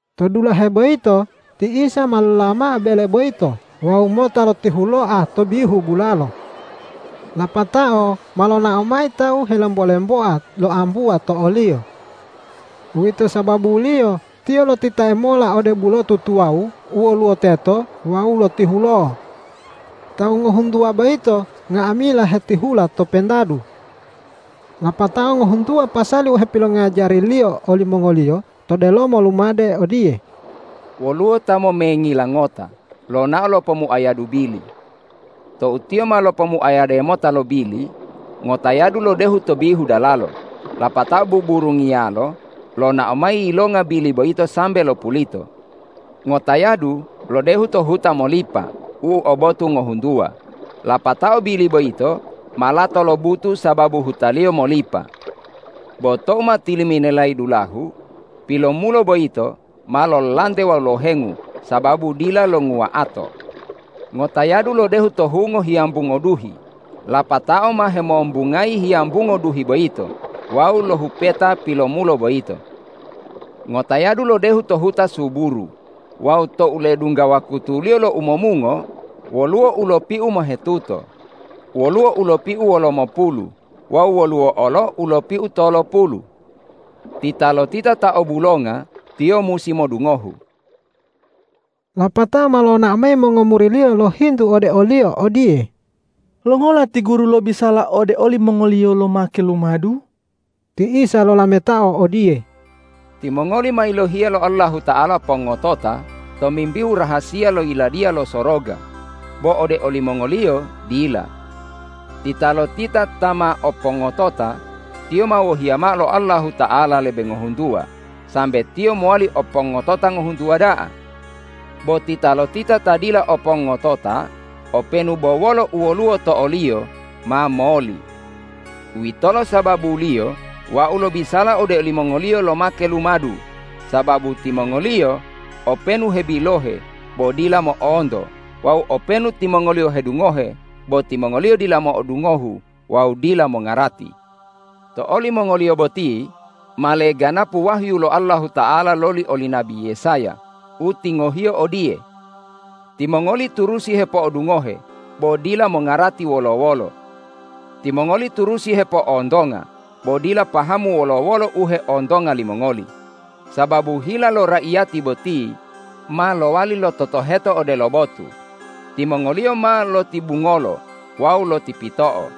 To dulahe boyito ti Isa ma lolola mao bele boyito wawu mota lotihuloa to bihu bulalo. Lapatao ma lonao mayi tawu helembo-lemboa loambuwa to o-Liyo. Uwito sababuliyo Tiyo lotitae mola ode bulotu tuwawu u woluwo teto wawu lotihulo'o. Tawu ngohuntuwa boyito nga'amila hetihula to pentadu. Lapatao ngohuntuwa pasali u hepilongajari-Liyo olimongoliyo to delomo lumade odiye,”Woluwo ta momengila ngota lonao lopomuayadu bili. Tou tiyo ma lopomuayade mota lo bili, ngotayadu lodehu to bihu dalalo, lapatao buburungiyalo lonao mayi yilonga bili boyito sambe lopulito. Ngotayadu lodehu to huta molipa u o botu ngohuntuwa, lapatao bili boyito ma lato lobutu sababu hutaliyo molipa. Bo tou ma tiliminelayi dulahu pilomulo boyito, ma lololante wawu lohengu sababu dila longuwa'ato. Ngotayadu lodehu to hungo hiyambungo duhi, lapatao ma hemombungayi hiyambungo duhi boyito wawu lohupeta pilomulo boyito. Ngotayadu lodehu to huta suburu. Wawu tou ledungga wakutuliyo lo umomungo, woluwo u lopiu mohetuto, woluwo u lopiu wolomopulu wawu woluwo olo u lopiu tolopulu. Titalotita ta o bulonga, tiyo musi modungohu!” Lapatao ma lonao mayi mongomuri-Liyo lohintu ode o-Liyo odiye,”Longola ti Guru lobisala ode olimongoliyo lomake lumadu?” Ti Isa lolametao odiye,”Timongoli ma yilohiya lo Allahuta'ala pongotota tomimbihu rahasiya lo Yiladiya lo Soroga, bo ode olimongoliyo dila. Titalotita ta ma o pongotota, tiyo ma wohiya mao lo Allahuta'ala lebe ngohuntuwa sambe tiyo mowali o pongotota ngohuntuwa da'a. Bo titalotita ta dila o pongotota, openu bo wolo u woluwo to oliyo ma moli. Uwitolo sababuliyo Wau lobisala ode olimongoliyo lomake lumadu, sababu timongoliyo openu hebilohe bo dila mo'onto wawu openu timongoliyo hedungohe bo timongoli dila mo'odungohu wawu dila mongarati. To olimongoliyo boti ma leganapu wahyu lo Allahuta'ala loli oli nabi Yesaya u tingohiyo odiye, ’Timongoli turusi hepo'odungohe bo dila mongarati wolo-wolo. Timongoli turusi hepo'ontonga bo dila pahamu wolo-wolo u heontonga limongoli. Sababu hila lo raiyati boti ma lowali lototoheto odelo botu; timongoliyo ma lotibungolo wawu lotipito'o.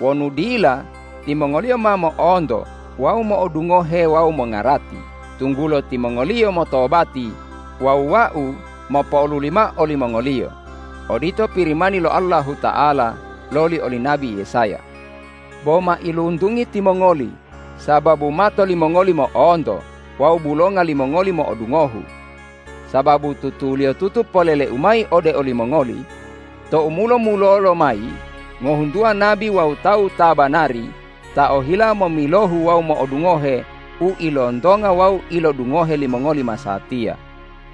Wonu dila, timongoliyo ma mo'onto wawu mo'odungohe wawu mongarati, tunggulo timongoliyo motobati wawu Wau mopo'oluli mao olimongoliyo.’ Odito Pirimani lo Allahuta'ala loli oli nabi Yesaya. Bo mailuntungi timongoli sababu mato limongoli mo'onto wawu bulonga limongoli mo'odungohu. Sababu tutuliyotutu polele-U mayi ode olimongoli: Tou mulo-mulolo mayi ngohuntuwa nabi wawu tawu ta banari ta ohila momilohu wawu modungohe u ilontonga wawu ilodungohe limongoli masatiya,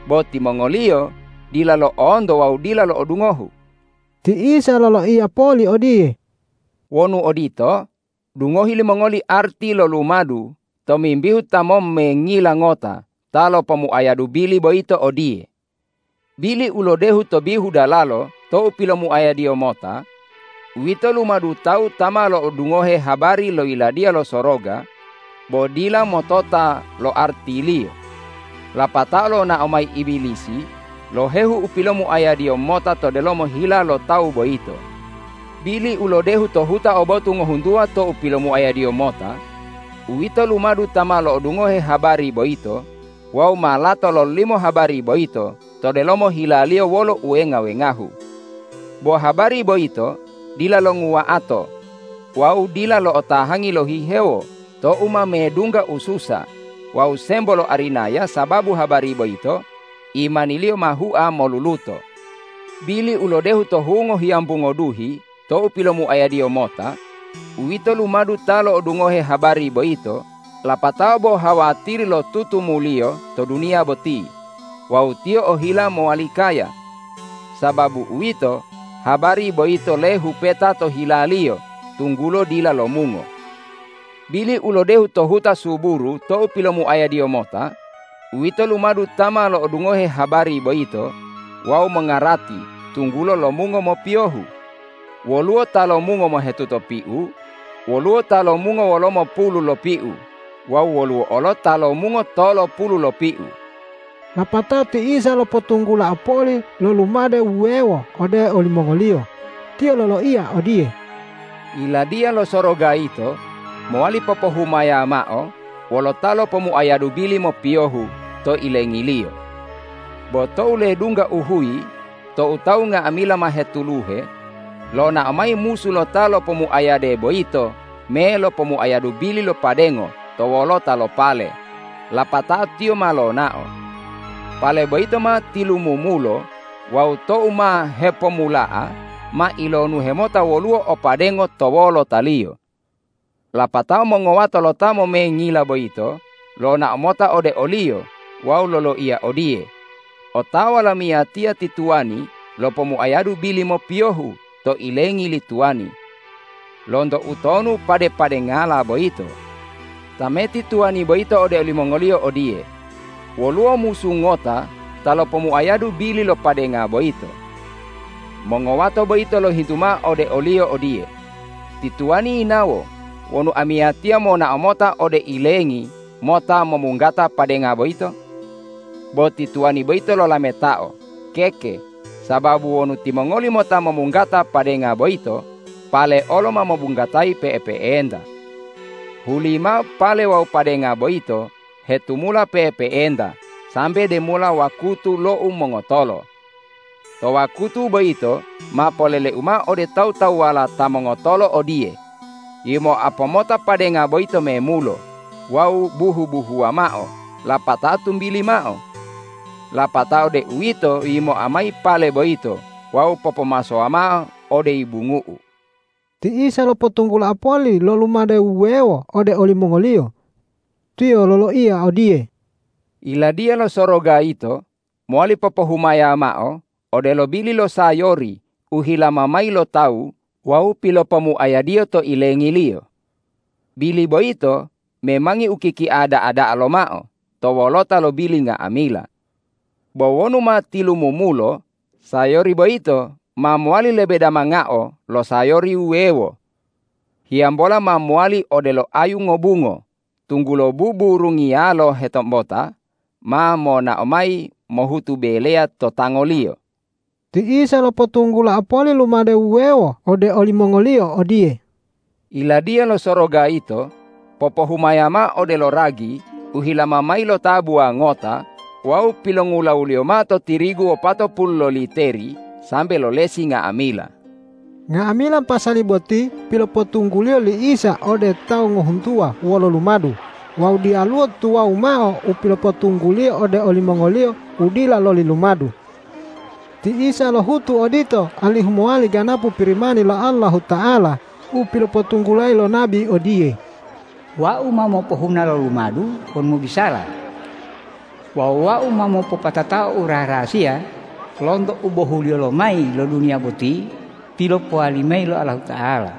bo timongoliyo dila lo'onto wawu dila lo'odungohu.” Ti Isa loloiya poli odiye,”Wonu odito, dungohi limongoli arti lo lumadu tomimbihu ta mommengila ngota ta lopomuayadu bili boyito odiye: Bili u lodehu to bihu dalalo tou pilomuayadiyo mota, uwito lumadu tawu ta ma lo'odungohe habari lo Yiladiya lo Soroga bo dila motota lo artiliyo. Lapatao lonao mayi Ibilisi lohehu u pilomuayadiyo mota to delomo hila lo tawu boyito. Bili u lodehu to huta o botu ngohuntuwa tou pilomuayadiyo mota, uwito lumadu ta ma lo'odungohe habari boyito wawu ma lato lololimo habari boyito to delomo hilaliyo wolo uwenga-wengahu. Bo habari boyito dila longuwa'ato wawu dila lo'otahangi lohihewo tou ma medungga ususa wawu sembo lo arinaya, sababu habari boyito imaniliyo ma hua moluluto. Bili u lodehu to hungo hiyambungo duhi tou pilomuayadiyo mota, uwito lumadu ta lo'odungohe habari boyito, lapatao bo hawatiri lo tutumuliyo to duniya boti wawu tiyo ohila mowali kaya. Sababu uwito, habari boyito lehupeta to hilaliyo tunggulo dila lomungo. Bili u lodehu to huta suburu tou pilomuayadiyo mota, uwito lumadu ta ma lo'odungohe habari boyito wawu mongarati tunggulo lomungo mopiyohu. Woluwo ta lomungo mohetuto piu, woluwo ta lomungo wolomopulu lopiu wawu woluwo olo ta lomungo tolopulu lopiu.” Lapatao ti Isa lopotunggulao poli lo lumade wuwewo ode olimongoliyo. Tiyo loloiya odiye,”Yiladiya lo Soroga yito mowali popohumaya mao wolo ta lopomuayadu bili mopiyohu to ilengiliyo. Bo tou ledungga uhuyi tou tawu nga'amila ma hetuluhe, lonao mayi musu lo ta lopomuayade boyito me lopomuayadu bili lo padengo to wolota lo pale, lapatao tiyo ma lonao. Pale boyito ma tilumumulo wawu tou ma hepomula'a ma ilonuhe mota woluwo o padengo to wolotaliyo. Lapatao mongowato lo ta momengila boyito lonao mota ode oliyo wawu loloiya odiye, ’Otawa lamiyatiya ti tuwani lopomuayadu bili mopiyohu to ilengi li tuwani. Lonto utonu pade-padengala boyito?’ Tameti tuwani boyito ode olimongoliyo odiye, ’Woluwo musu ngota ta lopomuayadu bili lo padenga boyito.’ Mongowato boyito lohintu mao ode oliyo odiye, ’Ti tuwani yinawo wonu amiyatiya monao mota ode ilengi mota momunggata padenga boyito?’ Bo ti tuwani boyito lolametao, ’Keke, sababu wonu timongoli mota momunggata padenga boyito, pale olo ma mobunggatayi pe'epe'enta. Hulimao pale wawu padenga boyito hetumula pe'epe'enta sambe demola wakutu lo umongotolo. To wakutu boyito ma poleleu mao ode tawu-tawuwala ta mongotolo odiye: Yimoa pomota padenga boyito memulo wawu buhu-buhuwa mao lapatao tumbili mao. Lapatao deuwito yimoa mayi pale boyito wawu popomasowa mao ode yibungu'u.’” Ti Isa lopotunggulao poli lo lumade wuwewo ode olimongoliyo. Tiyo loloiya odiye,”Yiladiya lo Soroga yito mowali popohumaya mao odelo bili lo sayori u hilama mayi lo tawu wawu pilopomuayadiyo to ilengiliyo. Bili boyito memangi u kikia da'a-da'a lomao to wolota lo bili nga'amila. Bo wonu ma tilumumulo, sayori boyito ma mowali lebe damangao lo sayori wuwewo. Hiyambola ma mowali odelo ayu ngobungo, tunggulo buburungiyalo hetombota ma monao mayi mohutu beleya to tangoliyo.” Ti Isa lopotunggulao poli lumade wuwewo ode olimongoliyo odiye,”Yiladiya lo Soroga yito popohumaya mao odelo ragi u hilama mayi lo tabuwa ngota wawu pilongulawuliyo mao to tirigu wopatopulu loliteri sambe lolesi nga'amila.” Nga'amila pasali boti pilopotunggu-Liyo li Isa ode tawu ngohuntuwa wolo lumadu wawu diyaluwo tuwawu mao u pilopotunggu-Liyo ode olimongoliyo u dila loli lumadu. Ti Isa lohutu odito alihu mowali ganapu Pirimani lo Allahuta'ala u pilopotunggulayi lo nabi odiye,”Wau ma mopohuna lo lumadu wonu mobisala. Wawu Wau ma mopopatatao u raha-rahasiya lonto ubohuliyo lomayi lo duniya boti pilopowali mayi lo Allahuta'ala.”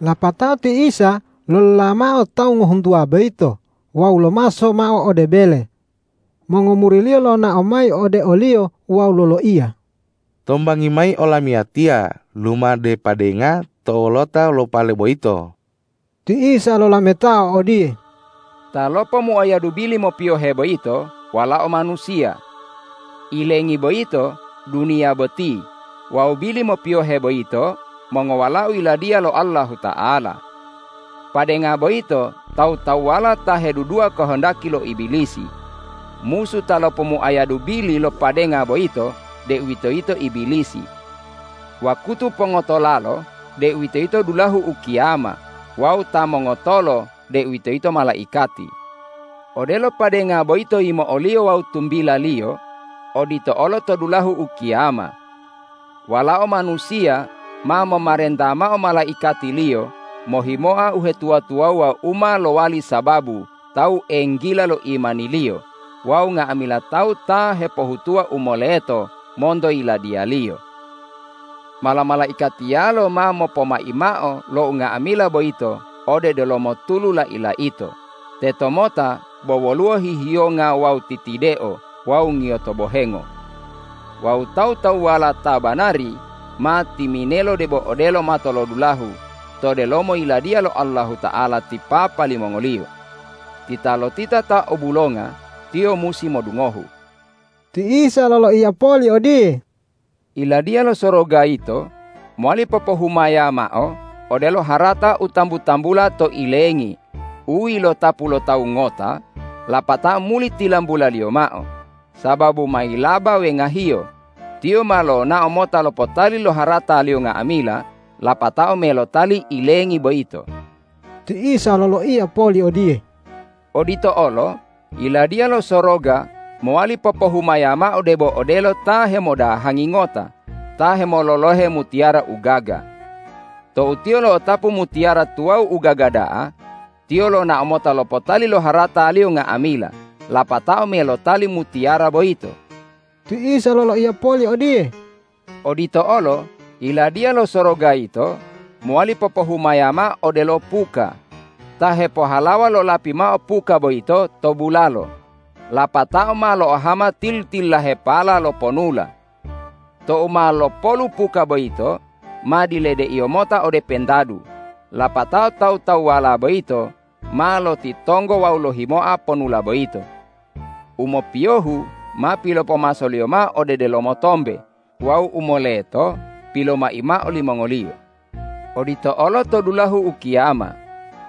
Lapatao ti Isa lolola mao tawu ngohuntuwa boyito wawu lomaso mao ode bele. Mongomuri-Liyo lonao mayi ode o-Liyo wawu loloiya,”Tombangi mayi olamiyatiya lumadu padenga to wolota lo pale boyito.” Ti Isa lolametao odiye,”Ta lopomuayadu bili mopiyohe boyito Walao Manusiya. Ilengi boyito duniya boti wawu bili mopiyohe boyito mongowalao Yiladiya lo Allahuta'ala. Padenga boyito tawu-tawuwala ta hedudua kohondaki lo Ibilisi. Musu ta lopomuayadu bili lo padenga boyito deuwitoyito Ibilisi. Wakutu pongotolalo deuwitoyito dulahu ukiyama wawu ta mongotolo deuwitoyito malaikati. Odelo padenga boyito yimo'oliyo wawu tumbilaliyo odito olo to dulahu ukiyama. Walao Manusiya ma momarenta mao malaikati-Liyo mohimoa uhetuwa-tuwawuwa u ma lowali sababu tawu enggila lo imaniliyo wawu nga'amila tawu ta hepohutuwa u moleto monto Yiladiya-Liyo. Mala-malaikatiyalo ma mopomai mao lo unga'amila boyito ode delomo tulu lai-laito, tetomota bo woluwo hihiyonga wawu titideo wawu ngiyoto bohengo. Wawu tawu-tawuwala ta banari ma timinelo debo odelo matolodulahu to delomo Yiladiya lo Allahuta'ala ti Papa limongoliyo. Titalotita ta o bulonga, tiyo musi modungohu!” Ti Isa loloiya poli odiye,”Yiladiya lo Soroga yito mowali popohumaya mao odelo harata u tambu-tambula to ilengi u yilotapu lo tawu ngota lapatao muli tilambulaliyo mao. Sababu ma yilaba wengahiyo, tiyo ma lonao mota lopotali lo harataliyo nga'amila lapatao me lotali ilengi boyito.” Ti Isa loloiya poli odiye,”Odito olo Yiladiya lo Soroga mowali popohumaya mao debo odelo ta hemodahangi ngota ta hemololohe mutiyara u gaga. Tou tiyo lo'otapu mutiyara tuwawu u gaga da'a, tiyo lonao mota lopotali lo harataliyo nga'amila lapatao me lotali mutiyara boyito.” Ti Isa loloiya poli odiye,”Odito olo Yiladiya lo Soroga yito mowali popohumaya mao odelo puka. Ta hepohalawa lolapi mao puka boyito to bulalo, lapatao ma lo'ohama tili-tililahepala lo ponula. Tou ma lopolu puka boyito, ma diledeiyo mota ode pentadu, lapatao tawu-tawuwala boyito ma lotitonggo wawu lohimoa ponula boyito. U mopiyohu ma pilopomasoliyo mao ode delomo tombe wawu u moleto pilomai mao limongoliyo. Odito olo to dulahu ukiyama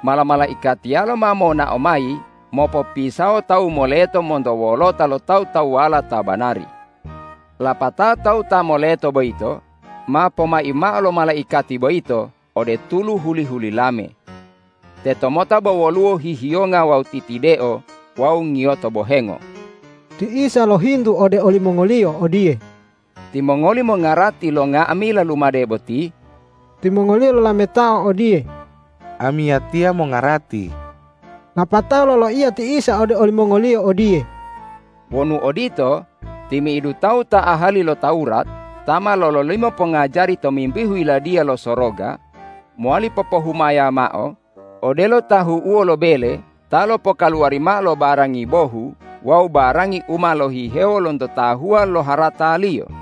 mala-malaikatiyalo ma monao mayi mopopisawo tawu moleto monto wolota lo tawu-tawuwala ta banari. Lapatao tawu ta moleto boyito ma pomai mao lo malaikati boyito ode tulu huli-hulilame. Tetomota bo woluwo hihiyonga wawu titideo wawu ngiyoto bohengo.” Ti Isa lohintu ode olimongoliyo odiye,”Timongoli mongarati lo nga'amila lumade boti?” Timongoliyo lolametao odiye,”Amiyatiya mongarati.” Lapatao loloiya ti Isa ode olimongoliyo odiye,”Wonu odito, timi'idu tawu ta ahali lo Tawurat ta ma lololimo pongajari tomimbihu Yiladiya lo Soroga, mowali popohumaya mao odelo tahu'uwo lo bele ta lopokaluwari mao lo barangi bohu wawu barangi u ma lohihewo lonto tahuwa lo harataliyo.”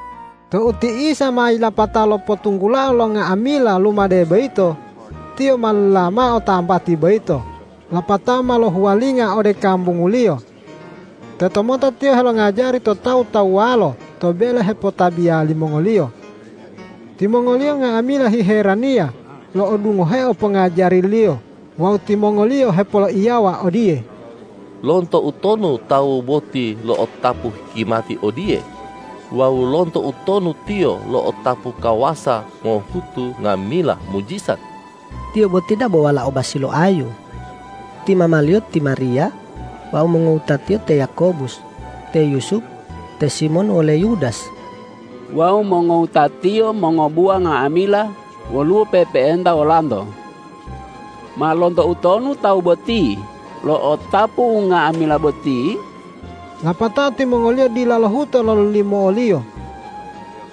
Tou ti Isa ma yilapato lopotunggulao lo nga'amila lumade boyito, Tiyo ma lolola mao tambati boyito lapatao ma lohuwalinga ode kambungu-Liyo. Tetomota Tiyo helongajari to tawu-tawuwalo to bele hepotabiya limongoliyo. Timongoliyo nga'amila hiheraniya lo'odungoheo pongajari-Liyo wawu timongoliyo hepoloiyawa odiye,”Lonto utonu tawu boti lo'otapu hikimati odiye wawu lonto utonu Tiyo lo'otapu kawasa mohutu nga'amila mujijat? Tiyo boti dabo walao basi lo ayu. Ti mama-Liyo ti Mariya wawu mongowuta-Tiyo, te Yakobus, te Yusup, te Simon wole Yudas. Wawu mongowuta-Tiyo mongobuwa nga'amila woluwo pe'epe'enta wolanto. Ma lonto utonu tawu boti lo'otapu unga'amila boti?” Lapatao timongoliyo dila lohuto lololimo o-Liyo.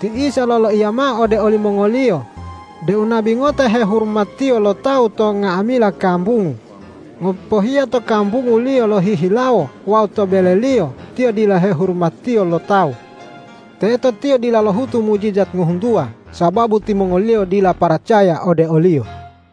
Ti Isa loloiya mao ode olimongoliyo deu nabi ngota hehurumatiyo lo tawu to nga'amila kambungu, ngopohiya to kambunguliyo lohihilawo wawu to beleliyo tiyo dila hehurumatiyo lo tawu. Teto Tiyo dila lohutu mujijat ngohuntuwa, sababu timongoliyo dila paracaya ode o-Liyo.